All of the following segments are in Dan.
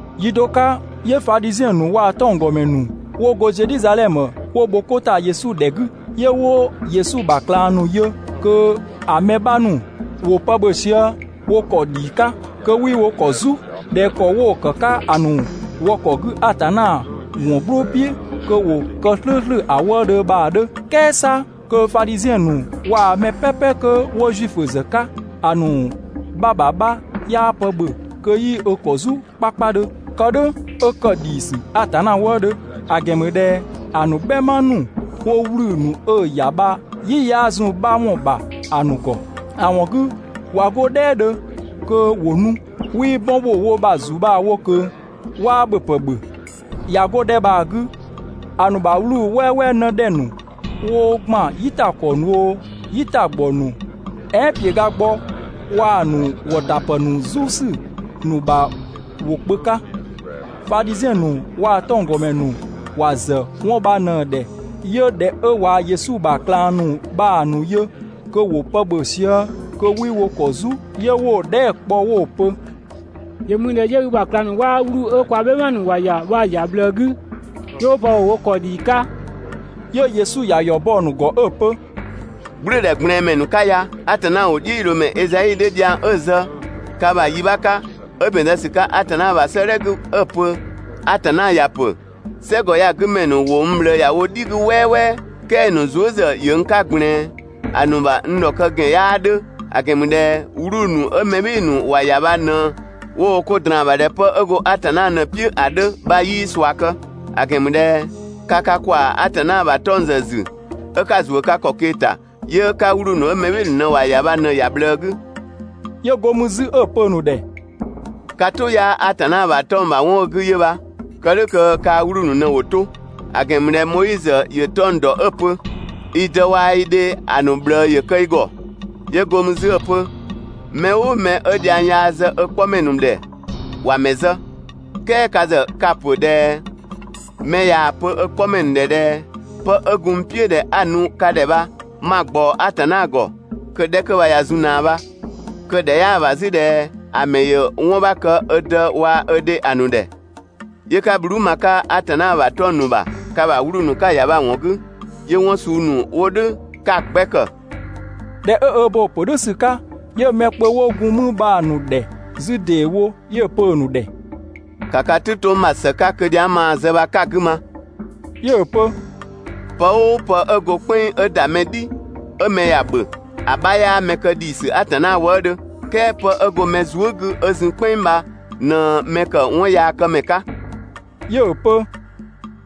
Yi do 'ka, 'yö Fadhiziɛn ‑nu waa‑ 'tɔnggɔmɛ ‑nu 'wo go Zedhizadhɛmö 'wo bho 'ko ‑ta Yesu ‑dhɛ 'gü. 'Yö 'wo Yesu ‑bha ꞊klang ‑nu yö kö‑ mɛ 'bha ‑nu ‑wo pë ‑bhö sië wo ‑kɔ ‑dhii 'ka, kö 'wii wo ‑kɔ "zu (꞊dhɛ ‑kɔ 'wo‑ ‑kë 'ka ‑a ‑nu wɔ ‑kɔ 'gü Atanna ‑wɔn "gblʋʋ "piʋ̈ kö 'wo kë "slʋ̈ʋ̈slʋ̈ ‑a wëëdhö bha‑ 'dhö). "Kɛɛ 'sa kö Fadhiziɛn ‑nu waa‑ mɛ "pɛpɛ 'kö 'wo Zuifö ‑zë 'ka, ‑a ‑nu 'bha ‑bha 'bha 'yaa pë ‑bhö kö 'yii ö ‑kɔ "zu 'kpakpadhö (kë "dhʋ̈ 'ö ‑kë ‑dhiisü Atanna wëëdhö), ‑a ‑gɛn ‑mü ꞊dhɛ ‑a ‑nu "bhɛma ‑nu 'wo 'wluu‑ ‑nu 'ö‑ ‑ya bha "yi 'yaa zun‑ 'bha ‑wɔn ‑bha ‑a ‑nu ‑gɔ. ‑A ‑wɔn 'gü, ꞊wa 'go "dhɛɛdhö kö ‑wo nu, 'wii 'bɔn ‑bho wo ‑bha ‑zu bha‑ wo ꞊kö, 'waa ‑bhöpë ‑bhö. ꞊Ya 'go‑ 'dhɛ bha‑ 'gü, ‑a ‑nu ‑bha 'wluu‑ "wɛɛwɛɛ 'në ‑dhɛ ‑nu 'wo ‑gban "yitakɔɔ ‑nu oo, "yitagbɔ ‑nu "ɛɛn ‑piögagbɔ waa‑ ‑nu ‑wɔtapë ‑nu "zu ‑sü ‑nu ‑bha ‑wo kpö 'ka. Fadhiziɛn ‑nu waa‑ 'tɔnggɔmɛ ‑nu ‑wa ‑zë 'wɔn bha ꞊në ‑dhɛ 'yö ꞊dhɛ 'ö ꞊wa Yesu ‑bha ꞊klang ‑nu bha‑ ‑nu yö kö ‑wo pë ‑bhö sië kö 'wii wo ‑kɔ "zu, 'yö 'wo‑ dhɛɛ" kpɔ 'wo‑ pö: «‑Yö mü ꞊dhɛ 'yö i ‑bha ꞊klang ‑nu 'waa 'wluu‑ 'ö kwa "bhɛma ‑nu ‑wa ‑ya bha‑ ‑ya ꞊bhlëë 'gü, 'yö 'wo pë ‑bhö wo ‑kɔ ‑dhii 'ka?» 'Yö Yesu ‑ya ‑yɔ bɔ‑ ‑nu ‑gɔ 'ö‑ pö: «"Gblʋ̈ʋ̈dhɛgblɛɛnmɛ ‑nu 'ka ya, Atanna ‑wʋdhiʋ̈loomɛ Ezai 'dhö dhiang 'ö‑ zë ka ‑bha yi 'bha 'ka 'ö ‑bɛn zë ‑sü 'ka Atanna ‑bha 'sëëdhɛ 'gü 'ö‑ pö: ‹Atanna ‑ya ‑pö: "Sɛgɔ ya‑ 'gü ‑mɛ ‑nu ‑wo n ꞊bhlëë ‑ya wo "dhi 'gü "wɛɛwɛɛ, "kɛɛ‑ ‑nu zuë" ‑zë ‑yö n 'ka ꞊gblɛɛn, ‑a ‑nu ‑bha n ‑dhɔkë ‑gɛn 'yaa 'dhö, ‑a ‑gɛn ‑mü ꞊dhɛ 'wluu‑ ‑nu 'ö mɛ "bhɩɩ‑ ‑nu ‑wa ‑ya bha ꞊në, 'wo wo 'ko ꞊draan‑ ‑bha ꞊dhɛ 'pë 'ö go Atanna ꞊në‑ "piʋ̈ ‑a 'dhö› bha 'yii ꞊sua kë; ‑a ‑gɛn ‑mü ꞊dhɛ ka ka ‑kwaa Atanna ‑bha 'tɔng‑ ‑zë ‑zü 'ö 'ka‑ ‑zuö ka ‑kɔ ꞊kee‑ ‑ta, 'yö 'ka 'wluu‑ 'ö mɛ "bhɩɩ‑ ‑nu ‑wa ‑ya bha ꞊në‑ ‑ya ꞊bhlëë 'gü. 'Yö go mü 'zü 'ö‑ pö‑ ‑nu ‑dhɛ: «Ka "tʋ 'yaa Atanna ‑bha 'tɔng‑ ‑bha 'wɔn 'ö‑ 'gü 'yö bha, kë "dhʋ̈ kö kaa‑ 'wluu‑ ‑nu ꞊në ‑wo 'to. ‑A ‑gɛn ‑mü ꞊dhɛ Moizö ‑yö 'tɔng‑ ‑dɔ 'ö‑ pö: ‹I dë waa‑ i dhe ‑a ‑nu ꞊bhlëë ‑yö kë i ‑gɔ.› 'Yö go mü 'zü 'ö‑ pö: Mɛ "ʋʋ mɛ 'ö dhiang yaa ze ö 'kpɔmɛ ‑nu ‑dhɛ, ‑wa ‑mɛ zë, "kɛɛ ka ‑zë, ka‑ ‑pö ꞊dhɛ: «Mɛ ꞊yaa‑ pö ö 'kpɔmɛ ‑nu ‑dhɛ ꞊dhɛ 'pë 'ö gun n "piʋ̈ ꞊dhɛ 'a‑ nu ka ‑dhɛ bha 'ma‑ ꞊gbaɔ Atanna ‑gɔ, kö‑ 'dhɛ bha ꞊ya zun ꞊naa bha.» Kö‑ ‑dhɛ 'yaa ‑bha 'zü ꞊dhɛ ‑a ‑mɛ ‑yö 'wɔn 'bha kë ö dë waa‑ ö dhe ‑a ‑nu ‑dhɛ, 'yö 'ka bhluu" ma‑ 'ka Atanna ‑bha 'tɔng‑ ‑nu ‑bha, ka ‑bha 'wluu‑ ‑nu 'ka‑ ‑ya bha‑ ‑wɔn 'gü. 'Yö 'wɔn suu ‑nu 'wo "dhʋ̈ 'ka‑ 'gbɛ ‑kë. ꞊Dhɛ 'ö ö bo‑ ‑pö "dhʋ̈ ‑sü 'ka, 'yö mɛ kpö 'wo gun mü bha‑ ‑nu ‑dhɛ 'zü ‑deewo, 'yö‑ pö‑ ‑nu ‑dhɛ: «‑Ka ka "tʋ 'to n ‑bha ‑së 'ka kö dhiang 'ö maa‑ zë bha 'ka‑ 'gü ma.» 'Yö‑ pö: «Pë "ʋʋ pë 'ö go "kpɛnng 'ö ‑da mɛ "dhi 'ö mɛ ‑ya ‑bhö, ‑a 'bha 'yaa mɛ kë ‑dhiisü Atanna wëëdhö, "kɛɛ 'pë 'ö go‑ ‑mɛ zuë" 'gü 'ö zun "kpɛnng bha ꞊në‑ ‑mɛ ‑kë 'wɔnyaakëmɛ 'ka. 'Yö‑ pö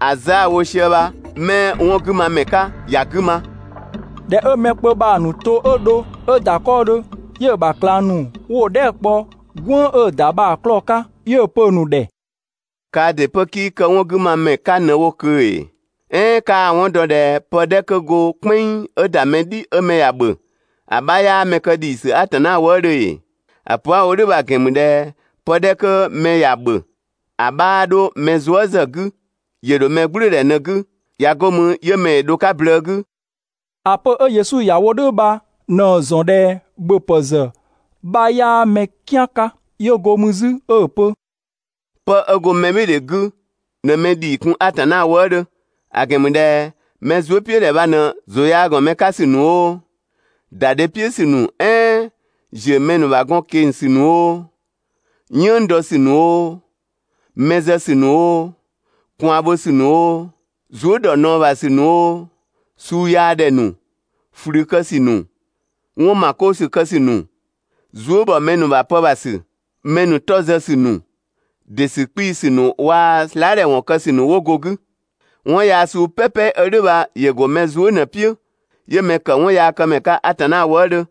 ‑a zë 'a‑ wo sië bha 'mɛ 'wɔn 'gü ma ‑mɛ 'ka, ‑ya 'gü ma. ꞊Dhɛ 'ö mɛ kpö bha‑ ‑nu to 'ö dho 'ö ‑da 'kɔɔdhö, 'yö‑ ‑bha ꞊klang ‑nu 'wo‑ dhɛɛ" kpɔ "gwënng 'ö‑ ‑da bha‑ 'klɔɔ‑ 'ka. 'Yö‑ pö‑ ‑nu ‑dhɛ: «Kaa ‑dɩ 'pö 'kii kë 'wɔn 'gü ma ‑mɛ 'ka ꞊në wo ꞊kö ‑ee? "Ɛɛn 'kaa‑ 'wɔn dɔ ꞊dhɛ pë 'dhɛ 'kö go "kpɛnng 'ö ‑da mɛ "dhi 'ö mɛ ‑ya ‑bhö, ‑a 'bha 'yaa mɛ ‑dhii kun Atanna wëëdhö ‑ee? ‑A pö 'a‑ wo "dhʋ̈ bha‑ ‑gɛn ‑mü ꞊dhɛ pë 'dhɛ 'kö mɛ ‑ya ‑bhö ‑a 'bhaa 'dho mɛ zuë" ‑zë 'gü, ‑yö ‑dho mɛ "gblʋ̈ʋ̈dhɛ ꞊në‑ 'gü, ꞊ya 'go mü 'yö mɛ dho‑ 'ka blëë 'gü.» (‑A pö 'ö Yesu ‑ya wo "dhʋ̈ bha ꞊në‑ ‑zɔn ꞊dhɛ ‑bhöpë ‑zë 'bha 'yaa mɛ "kian 'ka.) 'Yö go mü 'zü 'ö‑ pö: «'Pë 'ö go mɛbhɩɩdhe 'gü ꞊në mɛ ‑dhii kun Atanna wëëdhö. ‑A ‑gɛn ‑mü ꞊dhɛ mɛ zuëpiʋ̈dhɛ bha ꞊në ‑zʋ yaa ‑gɔn mɛ 'ka ‑sü ‑nu oo, ‑da dhe "piʋ̈ ‑sü ‑nu "ɛɛn ‑ziö mɛ ‑nu ‑bha gɔn ꞊keng‑ ‑sü ‑nu oo, "yënng dɔ ‑sü ‑nu oo, mɛ zë ‑sü ‑nu oo, ꞊kwaan bho ‑sü ‑nu oo, zuë" ‑dɔ ꞊naɔ ‑bha ‑sü ‑nu oo, suu yaa ‑dhɛ ‑nu, ꞊flü kë ‑sü ‑nu, 'wɔn ‑ma 'koo ‑sü kë ‑sü ‑nu, zuë" ‑bhɔ mɛ ‑nu ‑bha pë ‑bha ‑sü, mɛ ‑nu 'tɔ zë ‑sü ‑nu, ‑dɩ ‑sü 'kpii‑ ‑sü ‑nu waa‑ slaa" ‑dhɛ ‑wɔn kë ‑sü ‑nu 'wo go‑ 'gü. 'Wɔn yaa suu "pɛpɛ 'ö "dhʋ̈ bha, ‑yö ‑go mɛ zuë" ꞊në‑ "piʋ̈, 'yö mɛ ‑kë 'wɔnyaakëmɛ 'ka Atanna wëëdhö.»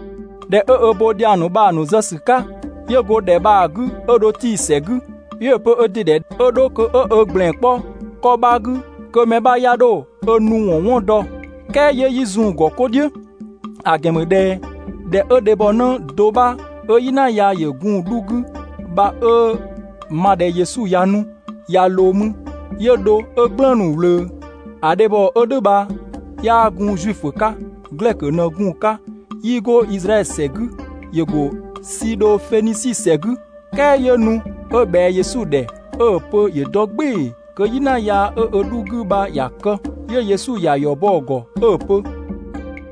꞊Dhɛ 'ö ö bo dhiang ‑nu bha‑ ‑nu zë ‑sü 'ka, 'yö go ‑dhɛ bha‑ 'gü 'ö dho Tii‑ ‑sɛ 'gü. 'Yö‑ pö ö ‑dɩ ‑dhɛ 'ö 'dho kö 'ö ö ‑gblɛn 'kpɔ 'kɔ 'bha 'gü kö mɛ 'bha 'ya 'dho ö nu ‑wɔn 'wɔn dɔ, "kɛɛ 'yö 'yii zun‑ ‑gɔ 'kɔ "dhiʋ̈. ‑A ‑gɛn ‑mü ꞊dhɛ ꞊dhɛ 'ö dhebhɔnë do 'bha 'ö "yina yaa ‑yö gun‑ 'dhu 'gü bha, 'ö‑ ma ꞊dhɛ Yesu ꞊ya nu ꞊ya ꞊loo mü, 'yö dho 'ö "gblëënu‑ ꞊wlöö. ‑A dhebhɔ 'ö "dhʋ̈ bha 'yaa gun Zuifö 'ka, Glɛkö ꞊në gun‑ 'ka, 'yii go Izraɛdhö ‑sɛ 'gü, ‑yö ‑go Sidhofenisi ‑sɛ 'gü. "Kɛɛ 'yö nu 'ö ꞊bhɛa Yesu ‑dhɛ 'ö‑ pö ‑yö dɔ "gbɩɩ‑ kö "yina yaa 'ö‑ 'dhu 'gü bha ‑ya kë. 'Yö Yesu ‑ya ‑yɔ bɔ‑ ‑gɔ 'ö‑ pö: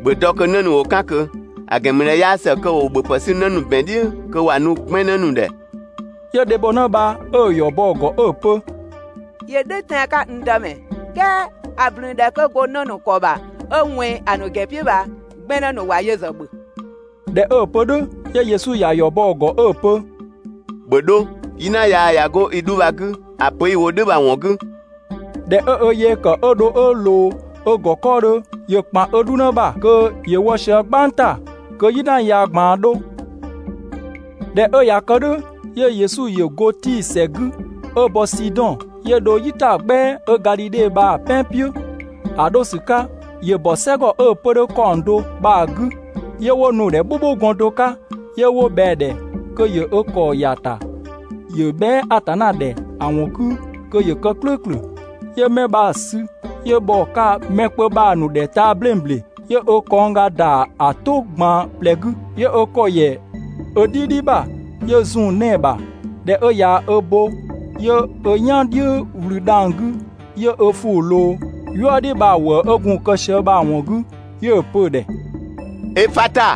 «‑Bhö dɔ kö 'në ‑nu ‑wo 'kën ꞊kö, ‑a ‑gɛn ‑mü ꞊dhɛ 'yaa ‑së kö ‑wo ‑bhöpë 'sü 'në ‑nu ‑bɛn "dhiʋ̈ kö ‑wa nu 'gbɛnnë ‑nu ‑dhɛ.» 'Yö dhebhɔnë bha 'ö‑ ‑yɔ bɔ‑ ‑gɔ 'ö‑ pö: «‑Yö "dhʋ̈ tɛan‑ 'ka, n Dëmɛ, "kɛɛ ‑a ꞊blün 'kö go 'në ‑nu ‑kɔ ‑bha 'ö ꞊wɛnng ‑a ‑nu ‑gɛn "piʋ̈ bha 'gbɛnnë ‑nu ‑wa yö ‑zë ‑bhö.» ꞊Dhɛ 'ö‑ pö "dhʋ̈, 'yö Yesu ‑ya ‑yɔ bɔ‑ ‑gɔ 'ö‑ pö: «‑Bhö 'dho, "yina yaa ꞊ya 'go i 'dhu bha‑ 'gü ‑a pö i‑ wo "dhʋ̈ bha‑ ‑wɔn 'gü.» ꞊Dhɛ 'ö ö yee kë 'ö dho 'ö ꞊loo ö ‑gɔ 'kɔɔdhö, ‑yö ‑kpan ö 'dhunë ‑bha kö ‑yö wɔ sië "gbang ‑ta, kö "yina yaa ꞊gbaan 'dho. ꞊Dhɛ 'ö ꞊ya kë "dhʋ̈, 'yö Yesu ‑yö go Tii ‑sɛ 'gü 'ö bɔ Sidɔn, 'yö dho "yitagbɛa 'ö Gadhidhe bha‑ "pɛan "piʋ̈. ‑A 'dho ‑sü 'ka ‑yö ‑bɔ "sɛ ‑gɔ 'ö‑ 'pö‑ 'dhö ‑kaɔng do bha‑ 'gü. 'Yö 'wo nu‑ ‑dhɛ "bhʋbhʋgɔn do 'ka, 'yö 'wo ꞊bhɛa‑ ‑dhɛ kö ‑yö ö ‑kɔ ‑ya ‑ta kö ‑yö bhɛa" Atanna ‑dhɛ ‑a ‑wɔn 'gü kö ‑yö kë "klʋ̈ʋ̈klʋ̈. 'Yö 'mɛ bha‑ sü, 'yö bhɔ‑ 'ka mɛ kpö bha‑ ‑nu 'ka taa‑ 'bleng ‑bleng, 'yö ö kɔngga ‑da ‑a "tʋ ꞊gban ꞊plɛ 'gü, 'yö ö ‑kɔ ‑yɛ 'ö "dhidhi ‑bha 'yö‑ zun‑ 'nɛɛ‑ ‑bha. ꞊Dhɛ 'ö ꞊ya ö bo, 'yö ö "yan "dhiʋ̈ ꞊wlü dhang‑ 'gü, 'yö ö ‑fʋʋ ꞊loo "yuëdhi bha‑ ‑wëë 'ö gun‑ kë sië bha‑ ‑wɔn 'gü, 'yö‑ pö‑ ‑dhɛ: «Efata!»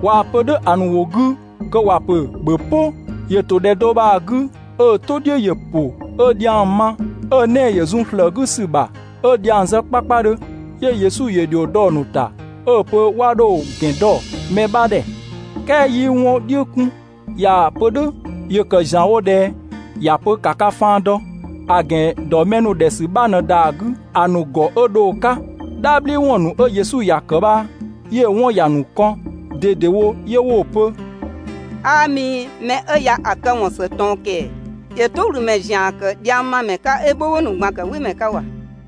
(꞊Waa‑ pö "dhʋ̈ ‑a ‑nu ‑wʋ 'gü kö ‑wa pö ‹‑bhö "pʋ!›.) ‑Yö ‑to ‑dhɛ do bha‑ 'gü, 'ö‑ "tʋ "dhiʋ̈ ‑yö ‑pʋ 'ö dhiang ma, 'ö‑ 'nɛɛ‑ ‑yö zun ‑slëë 'gü ‑sü ‑bha 'ö dhiang zë 'kpakpadhö. 'Yö Yesu ‑yö ‑dhio dɔ‑ ‑nu ‑ta 'ö‑ pö 'wa 'dho‑ ‑gɛn dɔ mɛ 'bha ‑dhɛ. "Kɛɛ 'yii 'wɔn "dhiʋ̈ 'kun, ꞊yaa‑ pö "dhʋ̈ ‑yö ‑kë ‑zianwo ꞊dhɛ ‑ya pö ‑ka ka faan dɔ. ‑A ‑gɛn dɔ mɛ ‑nu ‑dhɛ ‑sü 'bha ꞊në ‑da 'gü‑ ‑nu ‑gɔ 'ö dho‑ 'ka. "Dhabhliwɔn ‑nu 'ö Yesu ‑ya ‑kë bha, 'yö‑ 'wɔn ‑ya ‑nu kɔn ꞊dedewo, 'yö 'wo‑ pö: «'Aa mi, mɛ 'ö ya‑ këwɔn ‑së ꞊tɔn ‑kɛɛ! ‑Yö "tʋ ꞊wlü ‑mɛ ‑zian ‑kë dhiangmamɛ 'ka 'ö "bhʋbhʋ ‑nu ꞊gban ‑kë "wɩmɛ 'ka ‑wa!»